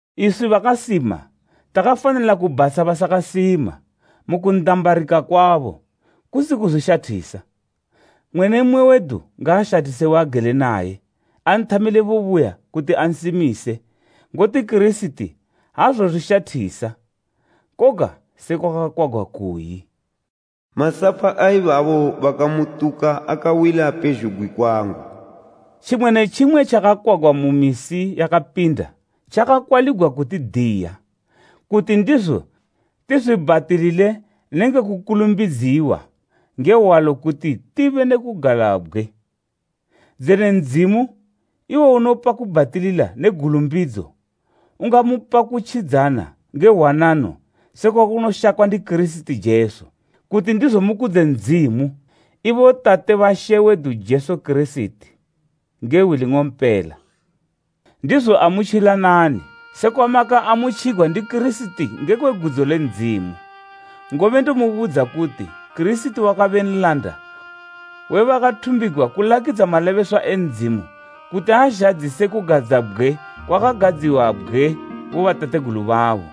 Iswi bakasima takafanila kubhatsha basakasima mu kundambarika kwabo, kusi kuzwishathisa. Mmwe ne mmwe wedu ngaashathise waagele naye, anthamile bubuya kuti ansimise. Ngoti Kirisiti aazozwishathisa. Koga sekwa kwakakwagwa kuyi, “Masapa a ibabo bakamutuka akawila pezhugwi kwangu.” Tjimwe ne tjimwe tjakakwagwa mu misi yakapinda, tjakakwaligwa kutidiya, kuti ndizo tizwibhatilile nenge kukulumbidziwa nge hwalo kuti tibe ne kugalabgwe. Dzene Ndzimu, iwo unopa kubhatilila ne gulumbidzo, ungamupa kutjidzana nge hwanano sekunoshakwa ndi Kirisiti Jesu, kuti ndizo mukudze Ndzimu, ibo Tate ba She wedu Jesu Kirisiti, nge hwi ling'ompela. Ndizo amutjilanani, sekwamakaamutjigwa ndi Kirisiti ngekwe gudzo le Ndzimu. Ngobe ndomubudza kuti Kirisiti wakabe nlanda we bakathumbigwa kulakidza malebeswa e Ndzimu kuti azhadzise kugadzabgwe kwakagadziwabgwe bobatategulu babo,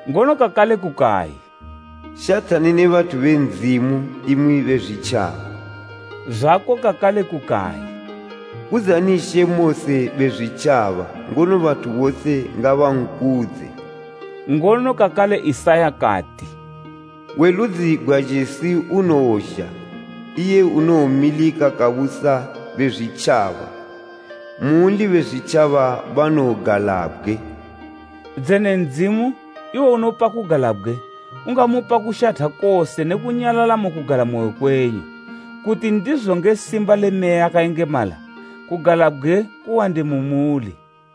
Ngono kakale kukayi, “Shathani ne bathu be Ndzimu imwi Bezwitjaba!” Zwako kakale kukayi, “Kudzani She mose Bezwitjaba, ngono bathu bose ngabankudze!” Ngono kakale Isaya kati, “We ludzi gwa Jesi unowozha; iye unomilika kabusa Bezwitjaba, munli Bezwitjaba banowogalabgwe.” Dzene Ndzimu, iwo unopa kugalabgwe, ungamupa kushatha kose ne kunyalala mu kugalamoyo kwenyu, kuti ndizo nge simba le Meya yakayengemala kugalabgwe kuwande mu muli.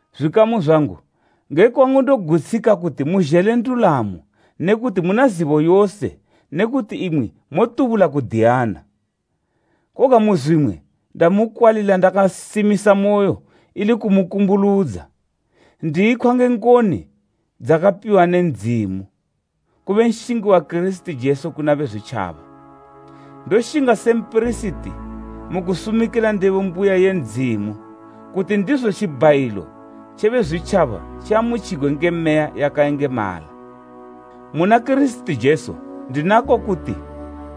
Zwikamu zwangu, nge kwangu ndogutshika kuti muzhele ndulamo ne kuti muna zibo yose ne kuti imwi motubula kudiyana. Koga muzwimwe ndamukwalila ndakasimisamoyo ili kumukumbuludza, ndiyikhwa nge ngoni dzakapiwa ne Ndzimu, kube nshingi wa Kirisiti Jesu kuna Bezwitjaba. Ndoshinga se mpirisiti mu kusumikila ndebo mbuya ye Ndzimu, kuti ndizo tjibhayilo tje Bezwitjaba tjiamutjigwe nge Meya yakayengemala. Muna Kirisiti Jesu, ndinako kuti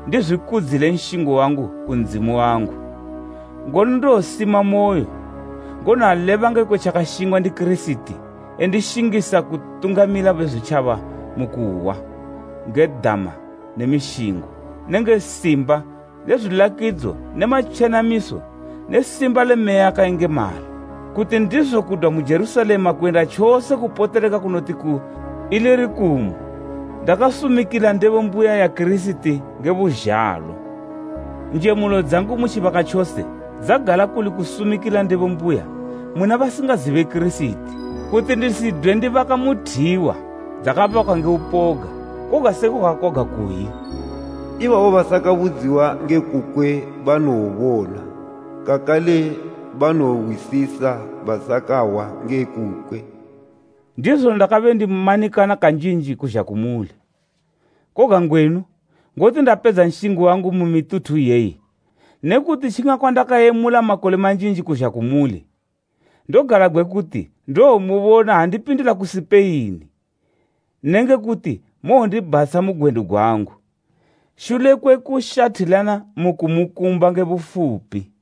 ndizwikudzile nshingo wangu ku Ndzimu wangu. Ngono ndowosimamoyo, ngono aleba ngekwe tjakashingwa ndi Kirisiti endishingisa kutungamila Bezwitjaba mu kuhwa, nge dama ne mishingo, nenge simba le zwilakidzo ne matjenamiso ne simba le Meya yakayengemala. Kuti ndizo kudwa mu Jerusalema kuyenda tjose kupoteleka kunoti ku Ilirikumu ndakasumikila ndebo mbuya ya Kirisiti nge buzhalo. Njemulo dzangu mu tjibaka tjose dzagala kuli kusumikila ndebo mbuya muna basingazibe Kirisiti, kuti ndisidwe ndibaka muthiwa dzakabakwa nge upoga. Koga sekwa kwakakwagwa kuyi, “Ibabo basakabudziwa nge kukwe banowobona, kakale banowohwisisa basakahwa nge kukwe.” Ndizo ndakabe ndimanikana kanjinji kuzha kumuli. Koga ngwenu, ngoti ndapedza nshingo wangu mu mituthu iyeyi ne kuti tjingakwandakayemula makole manjinji kuzha kumuli, ndogalabgwe kuti ndowomubona ha ndipindila ku Sipeini nenge kuti mowondibhatsha mu gwendo gwangu, shule kwe kushathilana mu kumukumba nge bufupi.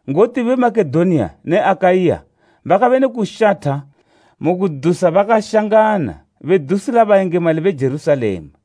Ngoti be Makedoniya ne Akaiya bakabe ne kushatha mu kudusa bakashangana bedusila bayengemali be Jerusalema.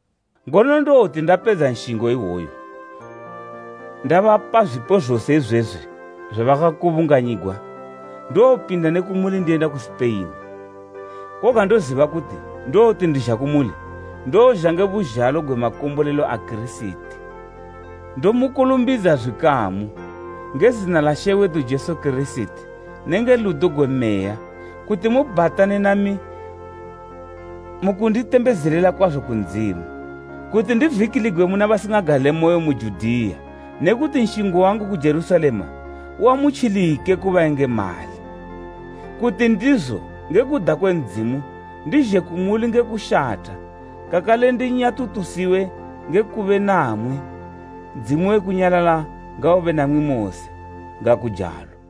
Ngono ndowoti ndapedza nshingo iwoyu, ndabapa zwipo zose izwezwi zwabakakubunganyigwa, ndowopinda ne kumuli ndiyenda ku Sipeini. Koga ndoziba kuti ndowoti ndizha kumuli, ndowozha nge buzhalo gwe makombolelo a Kirisiti. Ndomukulumbidza zwikamu, nge zina la She wedu Jesu Kirisiti nenge ludo gwe Meya kuti mu bhatane nami mu kunditembezelela kwazo ku Ndzimu, kuti ndivikiligwe muna basingagalemoyo mu Judiya ne kuti nshingo wangu ku Jerusalema uamutjilike ku bayengemali. Kuti ndizo, nge kuda kwe Ndzimu, ndizhe kumuli nge kushatha kakale ndinyatutusiwe nge kube namwi. Ndzimu we kunyalala ngaube namwi mose. Ngakujalo.